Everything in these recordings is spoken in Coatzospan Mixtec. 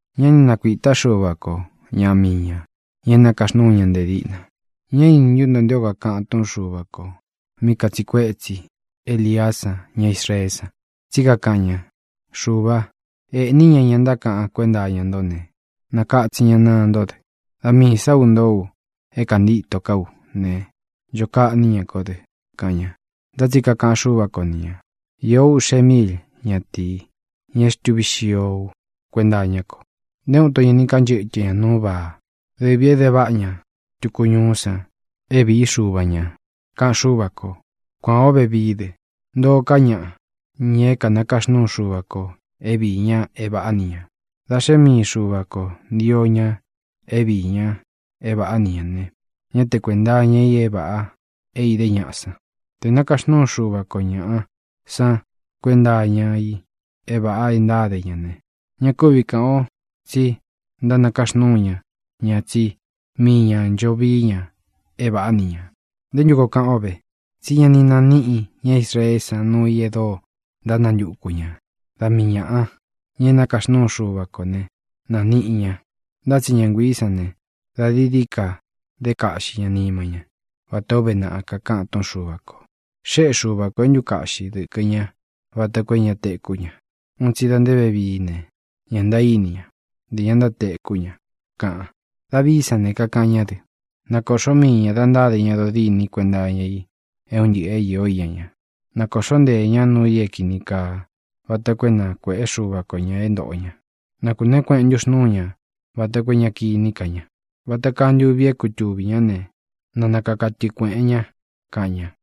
Ñá ni nakuīta Xúva ko ñaꞌa mii ñā, ña é nakaxnúu ña nte díꞌna. ¿Ñá ini ntú nto nté o kakāꞌan túꞌun Xuva kō mí katsiꞌi kuétsi Eliá san ña Israeé san? Tsí kakaꞌan ña: “Xuvā, ēꞌní ña ña ntákaꞌan kuénta iña nto ne, nākatsin ña naa ntó dɨ. Da miī sá u ntoó u é kāntíto ká u ne, ncho kaꞌní ña kó dɨ”, kaꞌan ña. Ntá tsi kakaꞌan Xúva ko ni ñā: “Īó uꞌxe míil ñatīi, ña é xtuvī xío ú kuenta iñá ko. Nté uun ito ña ni kanchɨ́tɨ ña nūú Baá, dɨvī é de váꞌa ña tuku ñuú san é vīí xuva ñā”, kaꞌan Xúva kō. Kuān ó vevií dɨ. Ntoo ká ñaꞌa, ña é nakaxnúu Xuva kō é viī ña é vāꞌá ni ñā. Dā xé mii Xuva kō ntío ña é viī ña é vāꞌá ni ñā ne, ñá te kuēnta iña i é vāꞌa é idé ñaꞌa san. Tē nakaxnúu Xuva ko ñāꞌa san kuénta iña i é vāꞌa e ntáde ña ne, ña kúvi kāꞌan o tsí nakaxnúu ña ña tsí mii ñā ncho vií ña é vāꞌá ni ñā. ¿Nté ntu koo kaꞌan ó ve? Tsí ña ni naníꞌi ña Israeé san nuu i e dóo ntánantuku ñā. Da mii ñāꞌa, ña é nakaxnúu Xuva ko ne, nāniꞌi ña. Ntá tsi ña nguiī sán ne, da dií dií ka dé kaꞌxi ña nima ña, vata ō uve naꞌa kakaꞌan túꞌun Xuva kō: “Xéꞌe Xuva kō é ntukaꞌxi dɨkɨ̄ ña vata koo é ña tekú ña. Un tsi da nte vevií ne, ña ntaíní ña, nte ña ntátekú ña”, kaꞌan. Davií san ne, kakaꞌan ñá dɨ: Na kōꞌxó mii ñā da ntáde ña dodîni kuénta iña i é un ntɨꞌɨ̄ é īó iña ña. Na kōꞌxó nteē ñá nuu i é kīni kaa vata koo é na kuēꞌé Xuva ko ñā é ntōꞌo ña. Na kūneé kueꞌen ntúxnūú ña vata koo é ña kiní ka ña. Vata kaa ntuvi é kutuvī ñá ne, na nakaka tɨꞌɨ kuēꞌen ña, kaꞌan ña.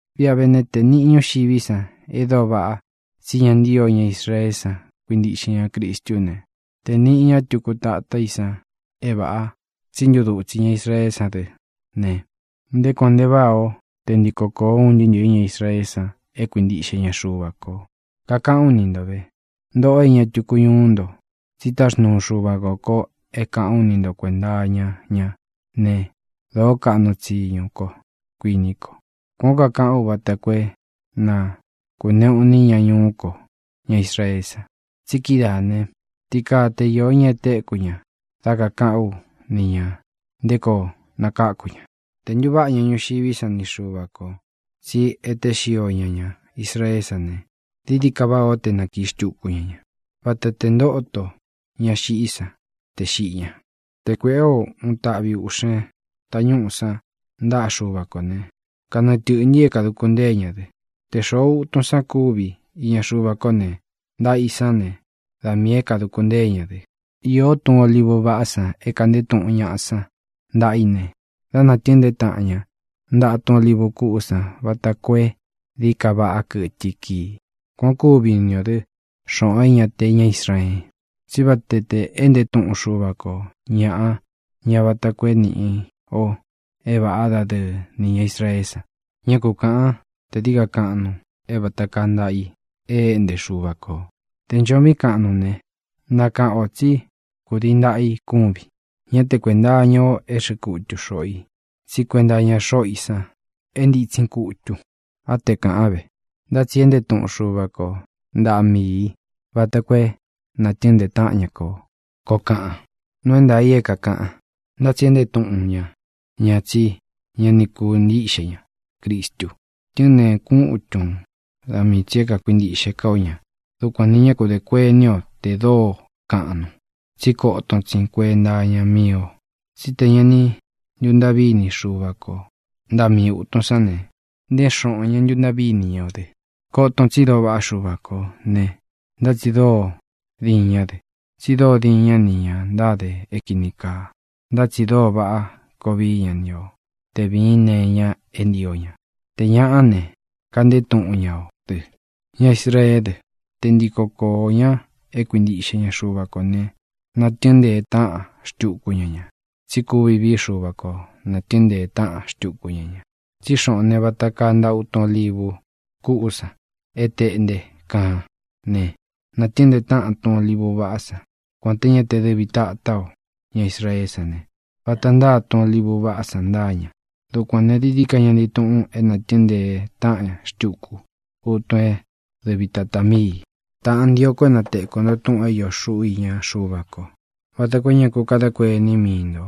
Viꞌa ve né, te nīꞌí ñuxiví san e dóo vaꞌa tsí ña ni ntio ña Israeé san kuíntiꞌxe ña Cristú ne, te nīꞌi ña tuku tatá i san é vāꞌa tsi ntúdutsi ña Israeé san dɨ́ ne, ¡nté kuān nte váꞌā ó te ntiko kōo un ntɨɨ́ ntɨ̄ɨ́ ña Israeé san é kuintiꞌxe ña Xuva kō! Kakaꞌán u ni nto vē, ntōꞌo é ña tuku ñuú nto, tsi táxnuu Xuva kō ko é kāꞌán u ni nto kuēnta iña ñá ne, dōó kaꞌnu tsiñu ko, kuiní ko. Kuān ó kakaꞌán u vata koo é na kūneꞌu iní ña ñuú ko, ña Israeé san. Tsi kídaā né, ti kaa te iō ña é tekū ña dá kakāꞌán u ni ñā nté koo nakáku ña. Tē ntuváꞌa ña ñuxiví san ni Xuva kō tsi éte xio ña ña Israeé san ne, dií dií ka váꞌā ó te nākiꞌi xtuku ña ña. Vata tē ntóto ña xiꞌí san tē xiꞌi ña. Te kuēꞌé o uun taꞌvi ūꞌxen tañúꞌu san ntaꞌa Xúva kō ne, kanɨɨ tɨ̄ꞌntɨ i é kāduku ntée ña dɨ. Te xōꞌo utun san kúvi iña Xuva kó ne, ntaꞌa i sán ne, da miī é kāduku ntée ña dɨ. Īó tun olívu vaꞌá san é kāꞌnté tuꞌun ñaꞌa san ntaꞌa i ne, dá nātɨɨn ntee táꞌan ña ntaꞌa tun olívu kuꞌú san vata koo é dií ka vaꞌá kɨtɨ i kii. Kuan ō kúvi ni ō dɨ́, xoꞌōn é ña te ña Israeen, tsí vata tē éꞌnte tuꞌun Xuva ko ñāꞌa ña vata koo é nīꞌi o é vāꞌá dadɨɨ ni ña Israeé san. Ñá ku kāꞌan te dií ka kaꞌnun é vata kaa ntaꞌa i e éꞌnte Xuva kō. Tē ncho viín kaꞌnun ne, nakaꞌan ō tsí kudii ntaꞌa i kúvin. Ñá te kuēnta iña o é xɨꞌɨ kutu xōꞌo i, tsí kuenta iña xoꞌo í san é ntitsin kutun. Á te kāꞌan ve: “Ntá tsi éꞌnte tuꞌun Xuva ko ntaꞌa mii ī vata koo é nātɨɨ́n ntee táꞌan ña ko”, koo kaꞌan. Nuu é ntaā i é kākaꞌan, ntá tsi éꞌnte tuꞌun ñá ña tsí ña ni kuintíꞌxe ña Cristu. Tɨ́ɨn nteen kutun da mii tsī é kākuintiꞌxe ká o ña. Dukuān ne, ñá ku dē kuení o tē dóo kaꞌnun, tsí koton tsin kuenta iña mii o. Tsí te ña ni ntuntaꞌví ini Xuva ko ntaꞌa mii ūtun sán ne, nté xoꞌōn ña ntuntaꞌví ini ña o dɨ. Koton tsi dóo vaꞌá Xuva kō ne, ntá tsi dóo diin ñá dɨ. Tsi dóo diin ñá nī ña ntáde é kīni kaa, ntá tsi dóo vaꞌá koo vií ña ni o te vīín nee iña é ntio ña. Tē ñaꞌá ne, kaꞌnté tuꞌun ñá o dɨ. Ña Israeé dɨ, te ntiko koō ña é kuintiꞌxe ña Xuva kō ne, nātɨɨ́n ntee táꞌan xtuku ña ña. Tsí kuvi vií Xuva ko nātɨɨ́n ntee táꞌan xtuku ña ña. Tsí xoꞌōn né, vata kaa ntaꞌa tun olívu kuꞌú san é tēꞌnte kaan ne, nātɨɨ́n ntee táꞌan tun olívu vaꞌá san, kuān té ña te dɨvi tātá o. Ña Israeé san ne, vata ntáa ntaꞌa tun olívu vaꞌá san ntáa ña. Dukuān ne, dií dií ka ña ntii tuꞌun é nātɨɨ́n ntee táꞌan xtuku utun é dɨvi tātá mii ī. Tāꞌán, ntio ko é na tekū nto túꞌūn é iō xuꞌú iña Xuva ko, vata koo é ña ku kadá kuení mii ntō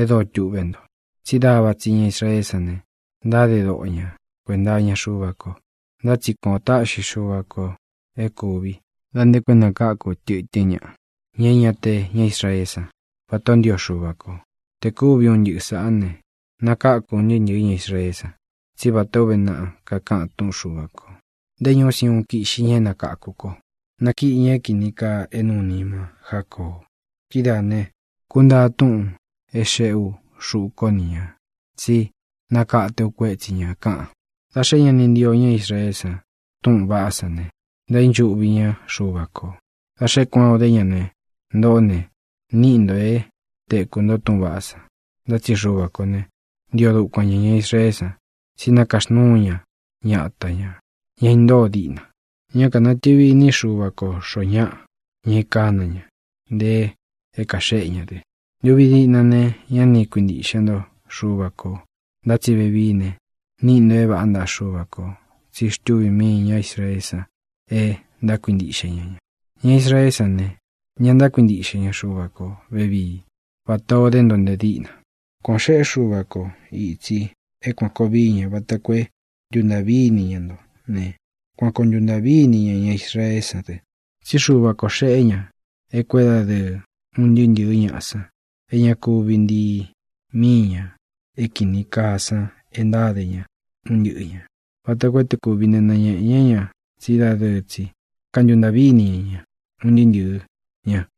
e dóo tuꞌvé nto: tsí dava tsi ña Israeé san ne, ntáde doꞌo ña kuēnta iña Xuva ko. Ntá tsi kuan ō táꞌxi Xuva kō é kūvi da nte koo é nakáku tɨtɨ́n ñaꞌa, ña é ña te ña Israeé san, vatā ó ntio Xuva kō. Tē kúvi un ntɨꞌɨ sāꞌá ne, nakáku un ntɨɨ́ ntɨ̄ɨ́ ña Israeé san. Tsí vatā ó uve naꞌa kakáꞌan túꞌun Xuva kō: Nté ñūú Siuun kiꞌxi ña é nakakū ko. Nakiꞌi ña é kīni kaa é nūu nima Jácoo. Kidáā ne, kuntáa túꞌūn é xēꞌe ú xuꞌu kó ni ñā tsí nakate u kuétsi ñā, kaꞌan. Dā xé ña ni ntío ña Israeé san túꞌūn vaꞌá san ne, ntaínchuꞌvi ñá Xuva kō. Dā xé kuān o dé ña ne, ntoꞌó ne, níꞌi ntō é tekū ntó túꞌūn vaꞌá san. Ntá tsi Xuva kō ne, ntio dukuan ñā ña Israeé san, tsí nakaxnúu ña ñata ñā, ña intóo diꞌna. Ñá kanatɨ̄vi iní Xuva ko xōo ñáꞌa, ña é kāna ña, nte é kaxéꞌe ña dɨ. Ntuvi diꞌna ne, ñá ni kuintiꞌxe nto Xuva kō. Ntá tsi vevií ne, níꞌi ntō é vāꞌá ntaꞌa Xuva kō tsi xtúvī mii ñá Israeé san e ntákuintiꞌxe ña ña. Ña Israeé san ne, ña ntákuintiꞌxe ña Xuva ko vēvií vatā o dé nto nte díꞌna. Kuan ō xeꞌé Xuva ko itsī é kuān koo vií ña vata koo é ntuntāꞌví ini ña nto ne, kuan koo ntuntāꞌví ini ña ña Israeé san dɨ. Tsí Xuva kō xeꞌé ña é kuédadɨɨ un ntɨɨ́ ntɨ̄ɨ́ ñaꞌa san é ña kuvi ntii míi ñā é kīni kaa san e ntáde ña un ntɨꞌɨ ñā, vata koo é tē kúvi ne, nañēꞌe ñá ña tsí dadɨɨ tsi kantuntāꞌví ini ña ña un ntɨɨ́ ntɨɨ̄ ña.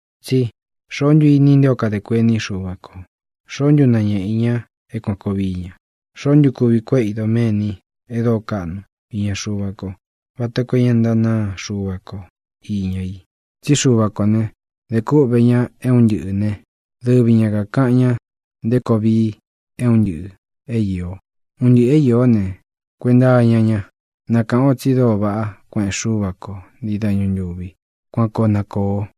Tsí “¿xoó ntu ini i nté o kadē kuení Xuva kō? ¿Xoó ntu nañéꞌe i ña é kuān koo vií ña? ¿Xoó ntu kuvi kuéꞌe i doméni e dóo kaꞌnu iña Xuva ko vata koo é na ntānáa Xuva ko īña i?” Tsí Xuva kō ne, de kúꞌvē ña é un ntɨꞌɨ̄ né, dɨvi ña kākaꞌan ña nté koo vii é un ntɨꞌɨ̄ é īo. Un ntɨꞌɨ̄ é īó ne, kuenta iña ña. Na kāꞌan o tsi dóo vaꞌá kueꞌen Xúva ko ntii dañu ntūvi. Kuan koo na kōo.